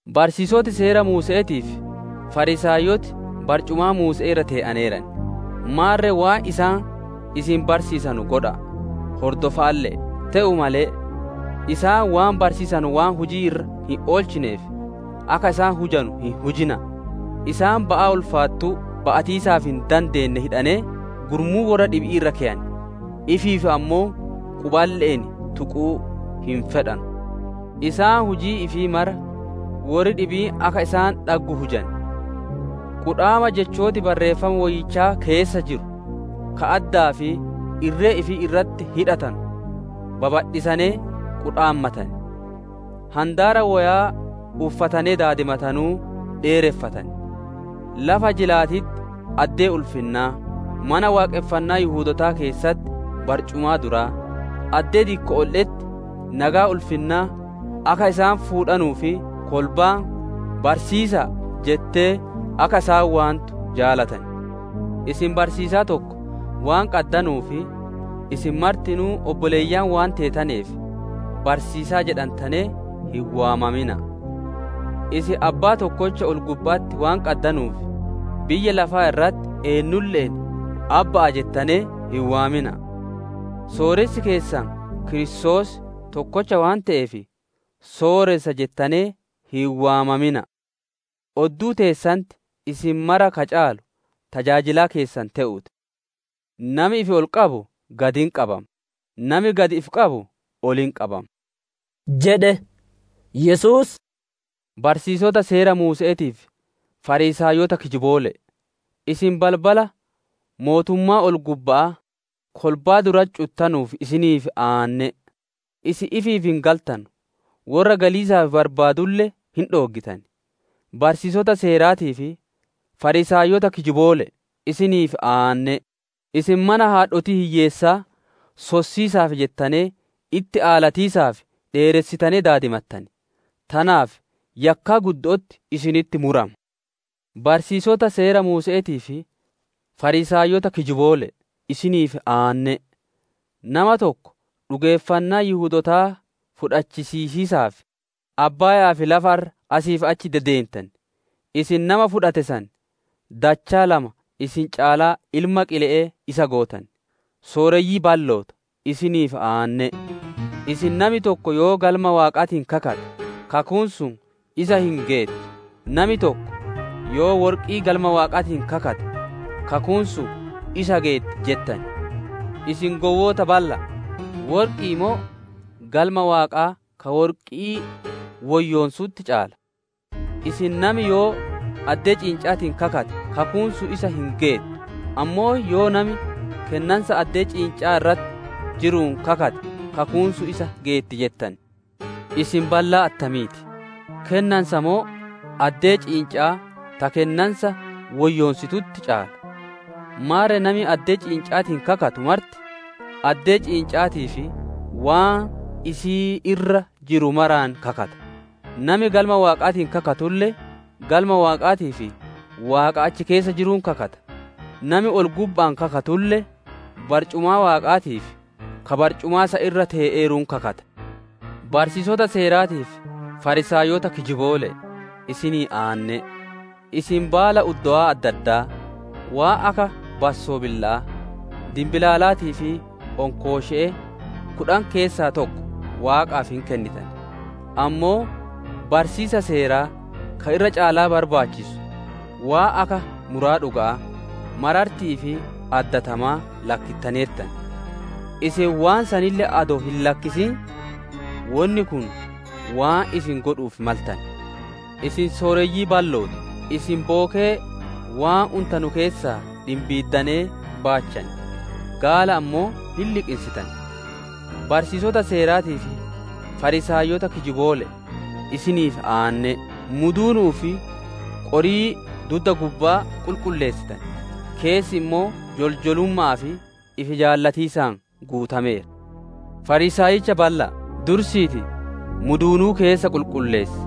«Barsiisoti Seera Muuse'eetii fi Fariisaayoti barcumaa Muuse'ee irra te'aneeran. Maarre waan isaan isin barsiisanu godha'a, hordofa'alle'e; te'uu male, isaan waan barsiisanu waan hujii irra hin oolchineef, akka isaan hujanu hin hujina'a. Isaan ba'aa ulfaattuu, ba'atiisaaf hin dande'ane hidhanee gurmuu worra dhibi'ii irra keyan; ifiif ammoo quballe'een tuquu hin fedhanu. Isaan hujii ifii mara worri dhibiin akka isaan dhaggu hujan; qudhaama Jechooti Barreeffama Woyyicha keessa jiru, ka addaa fi irree ifii irratti hidhatanu babadhisanee qudhaammatan; handaara woyaa uffatanee daadimatanuu dheereffatan. Lafa jilaatitti addee ulfinnaa, Mana Waaqonfannaa Yihudootaa keessatti barcumaa duraa, addee dikko'oolle'etti nageya ulfinnaa akka isaan fuudhanuu fi kolbaan ‹Barsiisa'a› jettee akka isaan waantu jaalatan. Isin barsiisaa tokko waan qaddanuu fi isin martinuu obboleeyyan waan teetaneef ‹Barsiisa'a› jedhantanee hin waamamina'a. Isin Abbaa tokkocha ol-gubba'atti waan qaddanuuf, biyya lafaa irratti eennulle'een ‹Abbaa› jettanee hin waamina'a. Sooressi keessan Kiristoos tokkocha waan te'eef, ‹Sooressa› jedhantanee hin waamamina'a. Odduu teessanitti isin mara ka caalu tajaajilaa keessan te'uu ti. Nami ol ifi qabu gad hin qabama, nami gad ifi qabu ol hin qabama» jedhe. Yesuus, «Barsiisota Seera Muuse'eetii fi Fariisaayota kijiboole'e! Isin balbala mootummaa ol-gubba'aa kolbaa duratti cuttanuuf, isiniif aanne'e! Isin ifiif hin galtanu, worra galiisaaf barbaadulle, hin dhooggitan. [ Barsiisota Seeraatii fi Fariisaayota kijiboole'e! Isiniif aanne'e! Isin mana haadhotii hiyyeessaa sossiisaaf jettanee itti aalatiisaaf dheeressitanee daadimattan; tanaaf yakkaa guddo'otti isinitti murama.] «Barsiisota Seera Muuse'eetii fi Fariisaayota kijiboole'e! Isiniif aanne'e! Nama tokko dhugeeffannaa Yihudootaa fudhachiisiisaaf abbaaya'aa fi lafa irra asii fi achi deddeentan, isin nama fudhate san dachaa lama isin caalaa ilma qile'ee isa gootan. «Sooreyyii balloota, isiniif aanne'e! Isin, ‹Nami tokko yoo Galma Waaqaatiin kakate, kakuun sun isa hin geettu, nami tokko yoo worqii Galma Waaqaatiin kakate, kakuun sun isa geetti› jettan. Isin gowwoota balla'a! Worqi'i moo Galma Waaqaa ka worqii woyyoonsutti caala? Isin, ‹Nami yoo addee ciinca'aatiin kakate, kakuun sun isa hin geettu; ammoo yoo nami kennansa addee ciinca'aa irra jiruun kakate, kakuun sun isa geetti› jettan. Isin ballaa attamiiti! Kennansa moo addee ciinca'aa ta kennansa woyyoonsitutti caala? Maarre nami addee ciinca'aatiin kakatu marti, addee ciinca'aatii fi waan isii irra jiru maraan kakata; nami Galma Waaqaatiin kakatulle, Galma Waaqaatii fi Waaqa achi keessa jiruun kakata; nami ol-gubba'aan kakatulle, barcumaa Waaqaatii fi ka barcumaa san irra tee'eeruun kakata. «Barsiisota Seeraatii fi Fariisaayota kijiboole'e! Isinii aanne'e! Isin baala uddowaa adda addaa, waan akka bassobila'aa, dinbilaalaatii fi onkooshe'e, kudhan keessaa tokko Waaqaaf hin kennitan, ammoo barsiisa Seeraa ka irra caalaa barbaachisu, waan akka muraa dhuga'aa, mararti'ii fi addatamaa lakkittaneertan. Isin waan saniille adoo hin lakkisin, wonni kun waan isin godhu'uuf maltane. Isin sooreyyii balloota! Isin bookee waan untanu keessaa dhimbiiddanee baachan, gaala ammoo hin liqinsitan. «Barsiisota Seeraatii fi Fariisaayotaa kijiboole'e! Isiniif aanne'e! Muduunu'uu fi qorii dudda gubbaa qulqulleessitan, keessi ammoo joljolumma'aa fi ifi-jaallatiisaan guutameera. Fariisaayicha balla'a! Dursiitii muduunuu keessa qulqulleessi,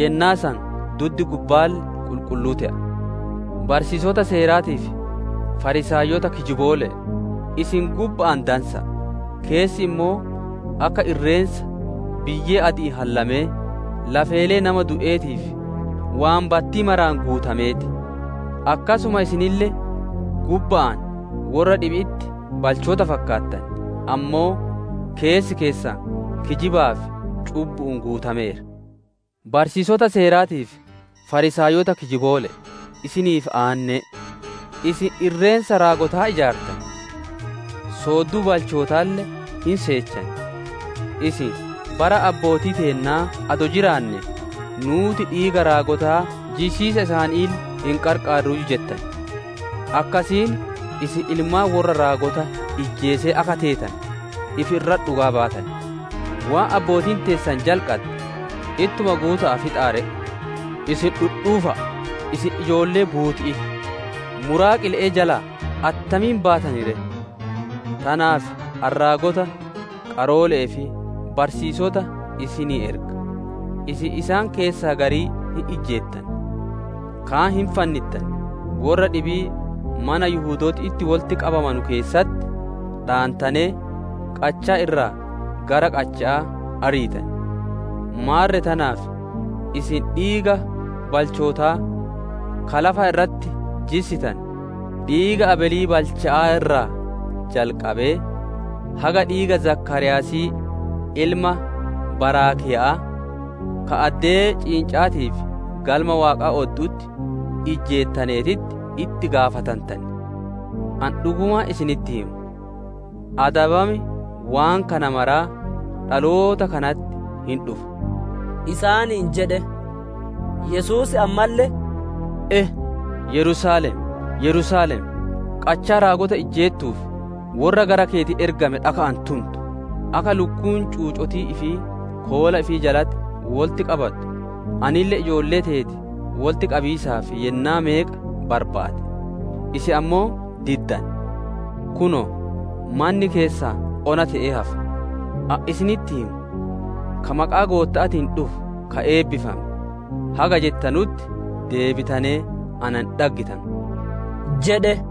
yennaa san duddi gubbaalle qulqulluu te'a. «Barsiisota Seeraatii fi Fariisaayota kijiboole'e! Isin gubba'aan dansa'a, keessaan ammoo akka irreensa biyyee adi'iin hallamee, lafeelee nama du'eetii fi waan battii maraan guutamee ti. Akkasuma isinille gubba'aan worra dhibi'itti balchoota fakkaattan, ammoo keessi keessan kijibaa fi cubbu'uun guutameera. «Barsiisota Seeraatii fi Fariisaayota kijiboole'e! Isiniif aanne'e! Isin irreensa raagotaa ijaartan; soodduu balchootaalle hin seettan. Isin, ‹Bara abbootii teennaa adoo jiraannee, nuuti dhiiga raagotaa jissiisa isaaniille hin qarqaarruuyyu› jettan. Akkasiin isin ilmaan worra raagota ijjeesee akka teetane ifi irratti dhugaa baatan. Waan abbootiin teessan jalqadde, ittuma guuta'aa fixaa ree! Isin dhudhuufa'a, isin ijoollee buuti'ii ti! Muraa qile'ee jalaa attamiin baatan ree? Tanaaf ani raagota, qaroole'ee fi barsiisota isinii erga; isin isaan keessaa garii hin ijjeettan, kaan hin fannittan, worra dhibii mana Yihudooti itti wolitti qabamanu keessatti dhaantanee qachaa irraa gara qacha'aa ariitan. Maarre tanaaf isin dhiiga balchootaa ka lafa irratti jissitane, dhiiga Abeelii balchichaa irraa jalqabee, haga dhiiga Zakaariyaasii ilma Baaraakiya'aa, ka addee ciinca'aatii fi Galma Waaqaa oddu'utti ijjeettaneetitti itti gaafatantan. Ani dhugumaan isinitti hima, adabam waan kana maraa dhaloota kanatti hin dhufa» isaaniin jedhe. Yesuus ammalle, «E! Yerusaalem, Yerusaalem, qachaa raagota ijjeettuu fi worra gara keeti ergame dhaka'aan tuntu! Akka lukkuun cuucotii ifii koola ifii jalatti wolitti qabattu, anille ijoollee teeti wolitti qabiisaaf yennaa meeqa barbaade; isin ammoo diddane. Kunoo, manni keessan ona te'ee hafe. Ani isinitti hima, ‹Ka maqaa Gootta'aatiin dhufu, ka eebbifame› haga jettanutti deebitanee na hin dhaggitanu» jedhe.